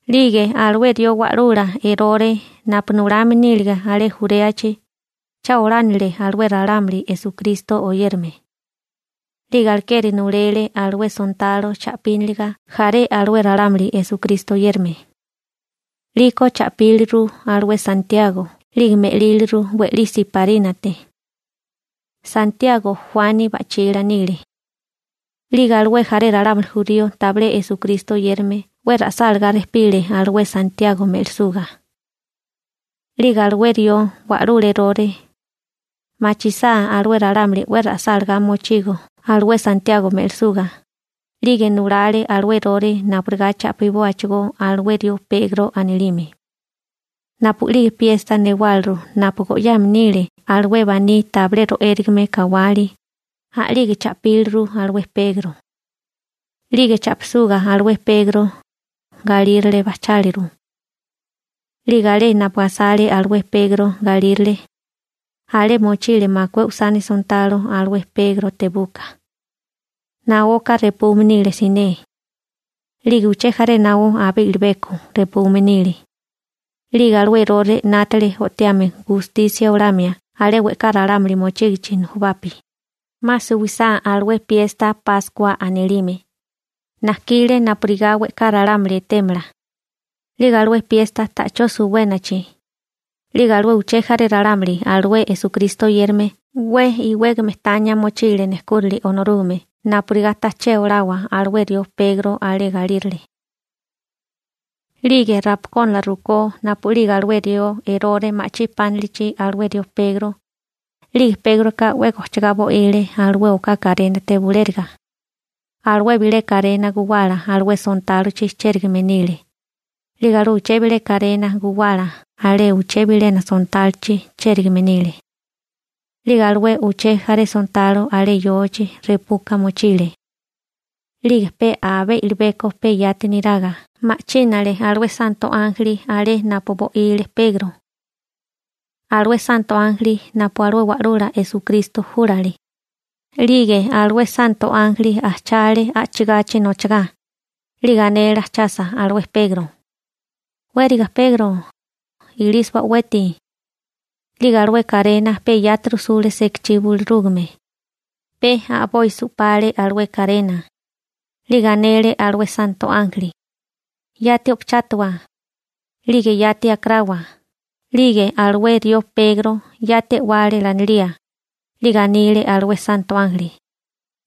'Lige alué rió wa'lula Erore napu nulame nílige alé Juréachi, cha olánile alué ralámuli Esukristo oyérame, 'lige alekeri nulele alué sontalo cha'píniliga jaré alué ralámuli Esukristo oyérame. 'Liko cha'píliru alué Santiago (Akobo) 'lige me'líliru we'lí siparínate. Santiago Juani ba'chila nile. 'Lige alué jaré ralámuli jurío tabilé Esukristo oyérame 'we ra'sálagá rejpile alué Santiago me'lisuga. 'Lige alué rió wa'lula Erore machisá alué ralámuli 'we ra'sálagá mochigo alué Santiago me'lisuga, 'lige nulale alué Erore napurigá cha'pibóachigó alué rió Pegro anilime. Napu'lige piesta newáliru napu go'yame nile alué baní tabilé ro'érigame kawali, a'lige cha'píliru alué Pegro. 'Lige cha'pisuga alué Pegro, galírale bajcháliru. 'Lige alé napu asale alué Pegro galírale, alé mochile makué usani sontalo alué Pegro tebuka. Naoka repume nile siné, 'lige uché jaré naó abé i'libeko repume nile. 'Lige alué Erore o'tiame 'nátale gustisia olamia alé we'ká ralámuli mochígichi nujubapi, 'ma suwisá alué piesta Páskua anilime. Najkile napurigá we'ká ralámuli etémala. 'Lige alué piesta ta'chó suwénachi, 'lige alué uché jaré ralámuli alué Esukristo oyérame 'we iwégame tania mochile nejkúrali Onorúgame napurigá taché olawa alué rió Pegro alé galírale. 'Lige rapakónala rukó napu'lige alué rió Erore ma'chí pánilichi alué rió Pegro, 'lige Pégroka 'we gochigá bo'ile alué oká karénate bulériga. Alué bilé karena guwala alué sontálochi chérigame nile, 'lige alué uché bilé karena guwala alé uché bilena sontálochi chérigame nile. 'Lige alué uché jaré sontalo alé yochi repuka mochile. 'Lige pe abé i'libeko pe yati niraga ma'chínale alué santo ánjeli alé napu bo'ile Pegro, alué santo ánjeli napu alué Wa'lula Esukristo júlale. 'Lige alué santo ánjeli ajchale a'chigachi nochagá. 'Lige anele ajchasa alué Pegro: ―Wériga Pegro, ilísiwa o'weti. 'Lige alué karena pe yati rujsule sekachí bulurúgame. Pe a'boi su'pale alué karena. 'Lige anele alué santo ánjeli: ―Yati o'pachátawa, 'lige yati akarawa. 'Lige alué rió Pegro yati e'wale lanilía. 'Lige anile alué santo ánjeli: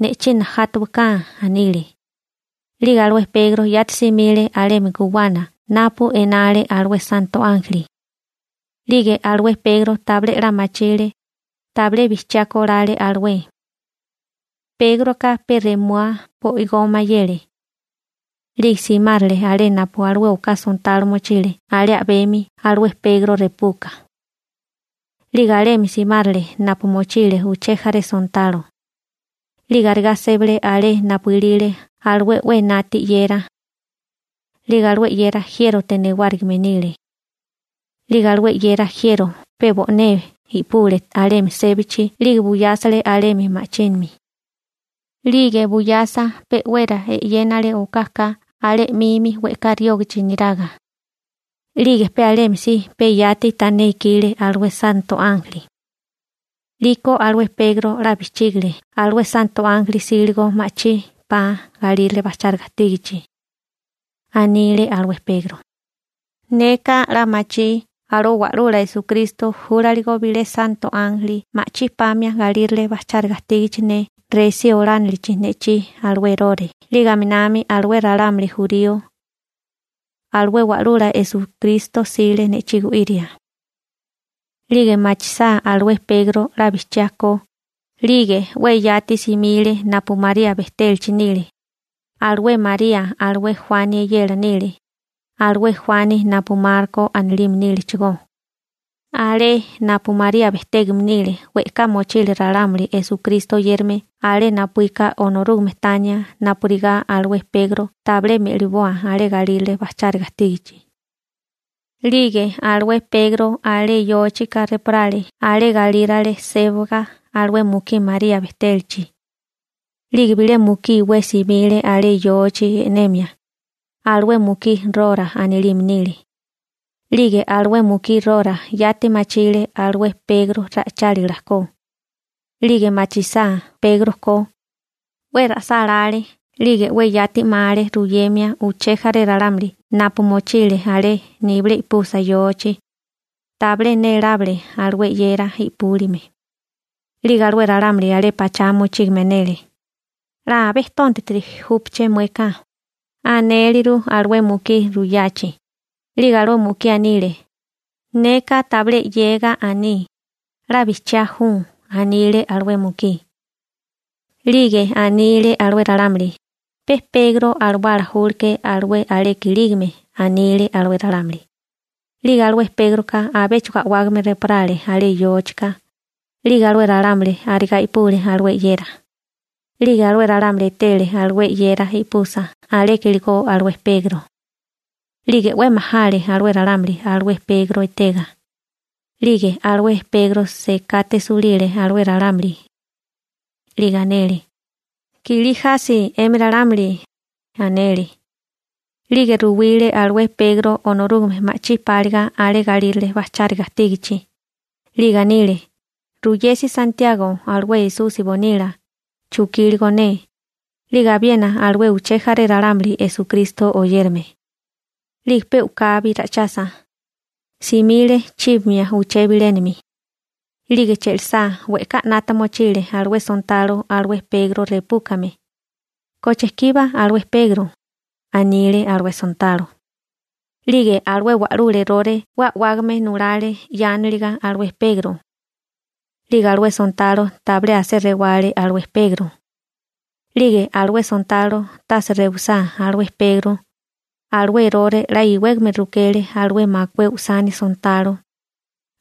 ―Ne'chí najátawaká ―anile. 'Lige alué Pegro yati simile alemi guwana napu enale alué santo ánjeli. 'Lige alué Pegro tabilé 'la machile, tabilé bijchiá kolale alué. Pégroka pe remua bo'igó mayele. 'Lige simárale alé napu alué oká sontalo mochile alé a'bemi alué Pegro repuka. 'Lige alemi simárale napu mochile uché jaré sontalo. 'Lige arigá sébale alé napu ilile alué 'we enati 'yera. 'Lige alué 'yera jiérote newárigime nile. 'Lige alué 'yera jiero pe bo'né i'pule alemi sébachi 'lige buyásele alemi ma'chimi. 'Lige buyasa pe'wera e'yénale okaka alé 'mimi we'ká riógichi niraga. 'Lige pe alemi si pe yati tané ikile alué santo ánjeli. 'Liko alué Pegro 'la bijchígile alué santo ánjeli 'síligo ma'chí 'pa galírale bajcháriga ajtígachi. Anile alué Pegro: ―Neka 'la machí alué Wa'lula Esukristo júlaligo bilé santo ánjeli ma'chí pamia galírale bajcháriga ajtígachi ne resí olánilichi ne'chí alué Erore 'lige aminami alué ralámuli jurío. Alué Wa'lula Esukristo 'sile ne'chí gu'iria. 'Lige machisá alué Pegro 'la bijchiá ko, 'lige 'we yati simile napu María bejtélachi nile. Alué María alué Juani eyela nile, alué Juani napu Marko anilime nílechigó. Alé napu María bejtégame nile we'ká mochile ralámuli Esukristo oyérame alé napuíka Onorúgame tania napurigá alué Pegro tabilé me'liboa alé galírale bajcháriga ajtígachi. 'Lige alué Pegro alé yóchika reporále alé galírale sébaga alué mukí María bejtélachi. 'Lige bilé mukí iwé simile alé yochi e'nemia. Alué mukí Rora anilime nile. 'Lige alué mukí Rora yati machile alué Pegro ra'ichálila ko. 'Lige machisá Pegro ko, 'we ra'sálále 'lige 'we yati 'male ruyemia uché jaré ralámuli napu mochile alé nibilé i'pusa yochi, tabilé nélábale alué 'yera i'púlime. 'Lige alué ralámuli alé pachá mochígame anele: ―'La abé tóntatiri júpaché mueka ―anéleru alué mukí ruyachi. 'Lige alué mukí anile: ―Neka tabilé 'yega aní, 'la bijchiá ju ―anile alué mukí. 'Lige anile alué ralámuli: ―Pe Pegro alawálala júleké alué aleka ilígame ―anile alué ralámuli. 'Lige alué Pégroka abéchigo a'wágame rejporale alé yóchika. 'Lige alué ralámuli arigá i'pule alué 'yera. 'Lige alué ralámuli etele alué 'yera i'pusa aleka iligó alué Pegro. 'Lige 'we majale alué ralámuli alué Pegro etega. 'Lige alué Pegro sekate sulile alué ralámuli. 'Lige anele: ―¡Kilí jasi 'emi ralámuli! ―anele. 'Lige ruwile alué Pegro Onorúgame ma'chí páliga alé galírale bajcháriga ajtígichi. 'Lige anile: ―Ruyesi Santiago alué napu Esusi nasípasi bonila ju, chukíligo ne, 'lige abiena alué uché jaré ralámuli Esukristo oyérame. 'Lige pe u'kabi ra'ichasa, simile chíbamia uché bilénami. 'Lige che'lisá we'ká 'nata mochile alué sontalo alué Pegro repúkame. ―¿Koche kiba alué Pegro? ―anile alué sontalo. 'Lige alué wa'lula Erore 'we a'wágame nulale 'yánaliga alué Pegro. 'Lige alué sontalo tabilé asé rewale alué Pegro. 'Lige alué sontalo tase rewisá alué Pegro, alué Erore 'la iwégame rukele alué makué usani sontalo,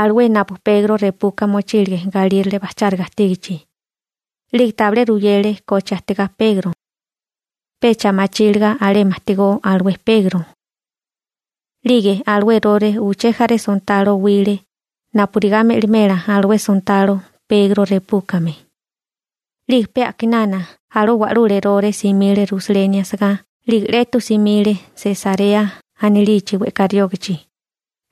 alué napu Pegro repuka mochílige galírale bajcháriga ajtígachi. 'Lige tabilé ruyele koche ajtigá Pegro, pecha machíliga alemi ajtigó alué Pegro. 'Lige alué Erore uché jaré sontalo owile napurigá me'limela alué sontalo Pegro repúkame. 'Lige pe a'kinana alué wa'lula Erore simile Rusaleni asagá 'lige 'letu simile Sesarea anilichi we'ká riógichi,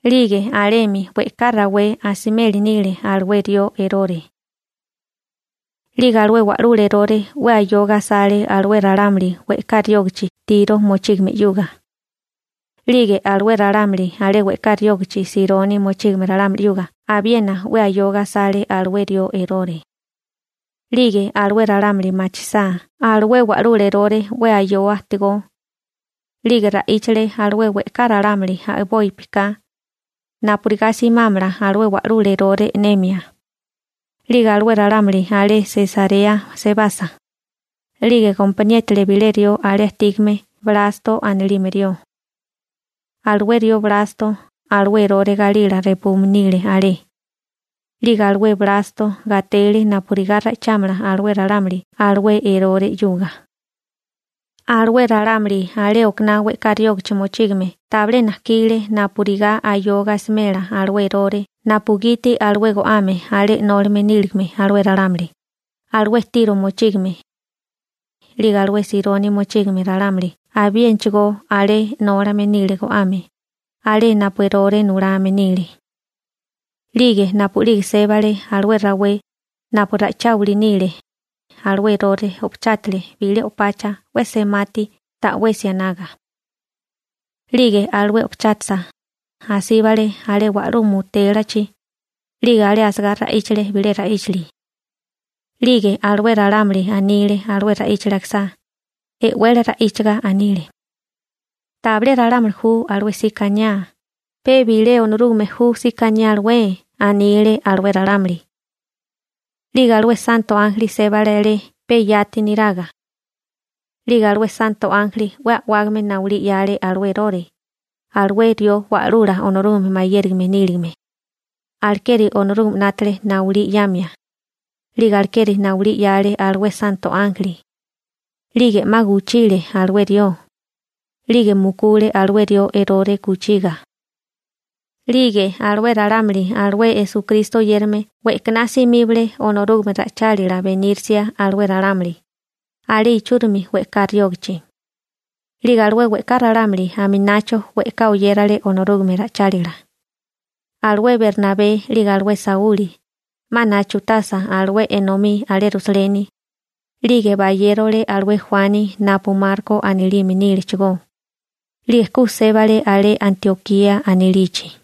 'lige alemi we'ká rawé asimeli nile alué rió Erore. 'Lige alué wa'lula Erore 'we ayoga asale alué ralámuli we'ká riógachi Tiro mochígame 'yuga. 'Lige alué ralámuli alé we'ká riógachi Sironi mochígame ralámuli 'yuga abiena 'we ayoga asale alué rió Erore. 'Lige alué ralámuli machisá alué wa'lula Erore 'we ayoa ajtigó, 'lige ra'íchale alué we'ká ralámuli a'bopi ka, napurigá simámala alué wa'lula Erore e'nemia. 'Lige alué ralámuli alé Sesarea sebasa, 'lige gompaniétale bilé rió alé ajtígame Blasto anilime rió. Alué rió Blasto alué Erore galila repume nile alé. 'Lige alué Blasto gatele napurigá ra'ichámala alué ralámuli alué Erore 'yuga. Alué ralámuli alé okaná we'ká riógichi mochígame tabilé najkile napurigá ayoga asimela alué Erore napugiti alué go'ame alé 'nólame níligame alué ralámuli, alué Tiro mochígame. 'Lige alué Sironi mochígame ralámuli abiénachigó alé 'nólame nile go'ame, alé napu Erore nulame nile. 'Lige napu'lige sébale alué rawé napu ra'icháwili nile, alué Erore o'pachátale bilé o'pacha 'we semati ta'wesi anaga. 'Lige alué o'pachátasa, asíbale alé wa'lú mutélachi. 'Lige alé asagá ra'íchale bilé ra'íchili. 'Lige alué ralámuli anile alué ra'íchali akisá, e'wele ra'íchaga anile: ―¡Tabilé ralámuli ju alué 'sika aniá, pe bilé Onorúgame ju 'sika aniá alué! ―anile alué ralámuli. 'Lige alué santo ánjeli sébale alé pe yati neraga. 'Lige alué santo ánjeli 'we a'wágame nayulí 'yale alué Erore. Alué rió wa'lula Onorúgame mayérime níligame. Alekeri Onorúgame 'nátale nayulí 'yamia. 'Lige alekeri nayulí 'yale alué santo ánjeli. 'Lige 'ma kuchile alué rió. 'Lige mukule alué rió Erore kuchiga. 'Lige alué ralámuli alué Esukristo oyérame we'kaná simíbale Onorúgame ra'ichálila benírisia alué ralámuli, alé ichúrimi we'ká riógichi. 'Lige alué we'ká ralámuli aminacho we'ká oyérale Onorúgame ra'ichálila. Alué Bernabé, 'lige alué Sauli, 'ma nachutasa alué enomí alé Rusaleni, 'lige bayérole alué Juani napu Marko anilime nílechigó, 'lige ku sébale alé Antiokía anilichi.